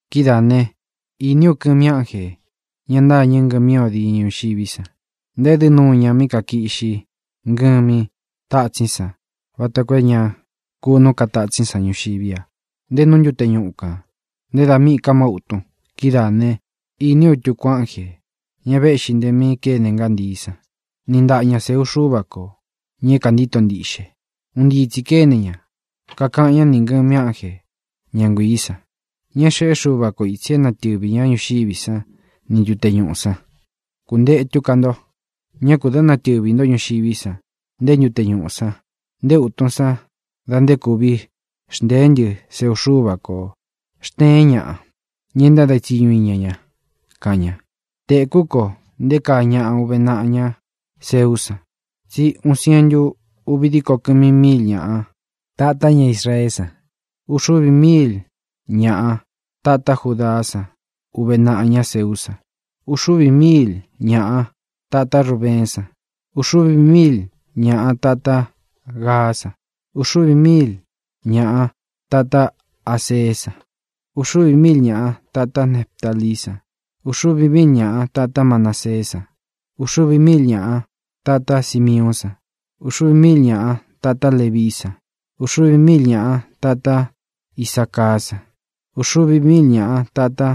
Kidáā né, īní u kɨmi ánjē, ña ntâñɨ ngɨmí o diñɨ ñuxiví san. Ntaédɨ́ nuu ña mí kakiꞌxi ngɨmí tatsín san vata koo é ña kunú ka tatsín san ñuxiví a, nté nú ntute ñuꞌu kān, nté da míꞌī ka má utun. Kidáā né, īní u tuku ánjē, ña véꞌxī nte mí kene ngántií san, niꞌi ntaꞌa ña sēu Xúva kō, ña é kāntíto ntiꞌxe. Un ntii tsī kéne ña, kakaꞌan ñá nī ngɨmi ánje, ña nguiī san, ña é xeꞌé Xuva ko ītsi é natɨvī ñá ñuxiví san ni ntute ñuꞌū san: —¡Kuntētu ká nto! ¡Ñá kū dɨ́ natɨvī ntó ñuxiví san, nté ntute ñuꞌū san, nté utun san dá nte kuvi xntēé ntɨ seu Xúva kō xteén ñaꞌa, ña e ntáde tsiñu iña ña! —kaꞌan ña. Tēkú ko nté kaa ñaꞌa uve naꞌa ña seú san, tsí uun sientu uvi díko kɨmi míil ñaꞌa tatá ña Israeé san. Uxuvi míil ñaꞌa tatá Judaá san uve naꞌa ña seú san, uxuvi míil ñaꞌa tatá Rubeén san, uxuvi míil ñaꞌa tatá Gaá san, uxuvi míil ñaꞌa tatá Aseé san, uxuvi míil ñaꞌa tatá Neftalií san, uxuvi míil ñaꞌa tatá Manaseé san, uxuvi míil ñaꞌa tatá Simiuún san, uxuvi míil ñaꞌa tatá Levií san, uxuvi míil ñaꞌa tatá Isacaá san, uxuvi míil ñaꞌa tatá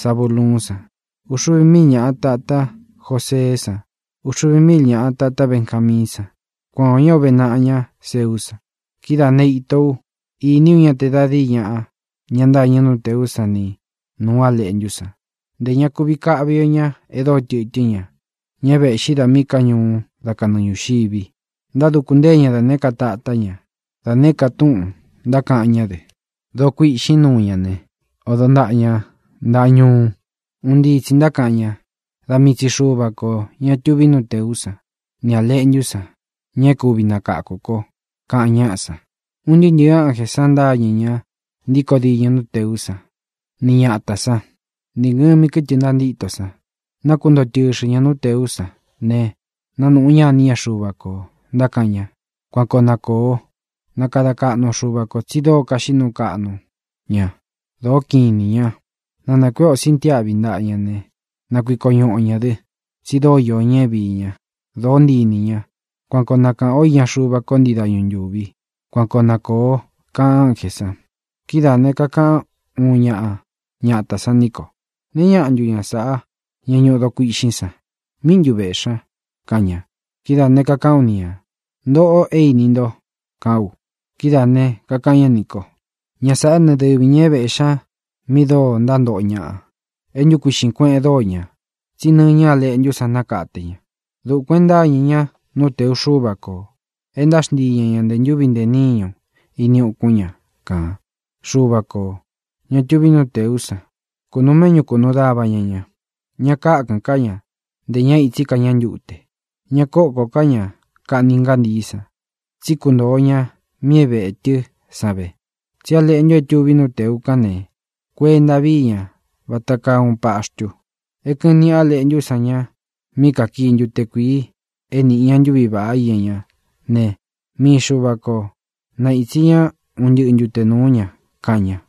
Zabuluún san, uxuvi míil ñaꞌa tatá Joseé san, uxuvi míil ñaꞌa tatá Benjamiín san. Kuan ō ñá uve naꞌa ña seú san. Kidáā né, īto ú, īní u ña te da díi ñaꞌa, ña ntâñɨ nú tēú san ni nūu A Leꞌntú san. Ntē ña kuvi káꞌvi o ñā e dóo tɨtɨ́n ña, ña é vēꞌxí da míꞌī ká ñuu dá kanɨɨ ñūxivi. Ntáduku ntée ña da nēé ka tatá ña; da nēé ka túꞌūn ntákaꞌan ñá dɨ. Doo kuiꞌxín ñuꞌu ña ne; odo ntaꞌa ña ntāꞌa ñuu. Un ntii tsi ntákaꞌan ña: Da mii tsi Xuva kō, ña tuví nú tēú san, nī A Leꞌntú san, ña é kuvi nakáku kō, kaꞌan ñáꞌa san. Un ntɨɨ́ ntɨ̄ɨ ánjē san ntáñɨ̄ ña ntíkō diñɨ nú tēú san, ni ñatā sán, nī ngɨmi kɨ́tɨ ntantíto san. Nákuntoo tɨxɨ ñā nú tēú san ne, nánūꞌu ñá iní ña Xuva kō, ntákaꞌan ña: ¡Kuan koo na kōo! Na kada kaꞌnu o Xuva kō, tsi dóo kaxiꞌí nuu kaꞌnu ña, dōó kiꞌin inī ña. Na nākuéꞌe ō sintiáꞌvi ntaꞌa ña ne, na kuiko ñuꞌu o ñā dɨ, tsi dóo iō ña é viī ña; dōó ntii inī ña. Kuan koo na kāꞌan o íña Xuva ko ntii dañu ntúvi. Kuan koo na kōo, kaꞌan ánjē san. Kidáā ne, kakaꞌan úun ñaꞌa ñatā san ní ko: —¿Nēe ñáꞌa ntu ña sāꞌá, ña ñuꞌu doo kuiꞌxín san? ¿Míꞌi ntu vēꞌxi ña? —kaꞌan ña. Kidáā ne, kakaꞌán u ni ñā: —Ntōꞌo é īni nto —kaꞌán u. Kidáā ne, kakaꞌan ñá nī kó: —Ña sāꞌá ne, dɨvi ñā é vēꞌxi ña mi dóo ntántoꞌo ñaꞌa. É ntukuiꞌxīn kueꞌen dóo ña, tsí nɨñɨ Á Leꞌntú san nákate ña. Dukuān e ntáñɨ̄ ñá nú tēu Xúva kō, e ntáxntii ña ñā nte ntúvi ntē níñu ini ukún ña kān. Xuva kō, ña tuvi nú tēú san, kunuu méꞌñu kunuu dava ña ña. Ña kákɨ̄n ká ña, ntē ñá ītsí ka ñá ntute. Ña kókō ká ña kaꞌni ngántií san, tsí kuntoo ña mi é vētɨ́ san ve. Tsí A Leꞌntu é tuví nú tēu kán ne, kuenta vií ña vata kaa uun paxtu, é kɨ̄ꞌɨn níꞌi A Leꞌntú san ña mí kakii ntute kuīi é nīꞌi ñá ntuvi íña ñá ne, mii Xuva ko naītsi ñá un ntɨꞌɨ ntute nūú ña —kaꞌan ña.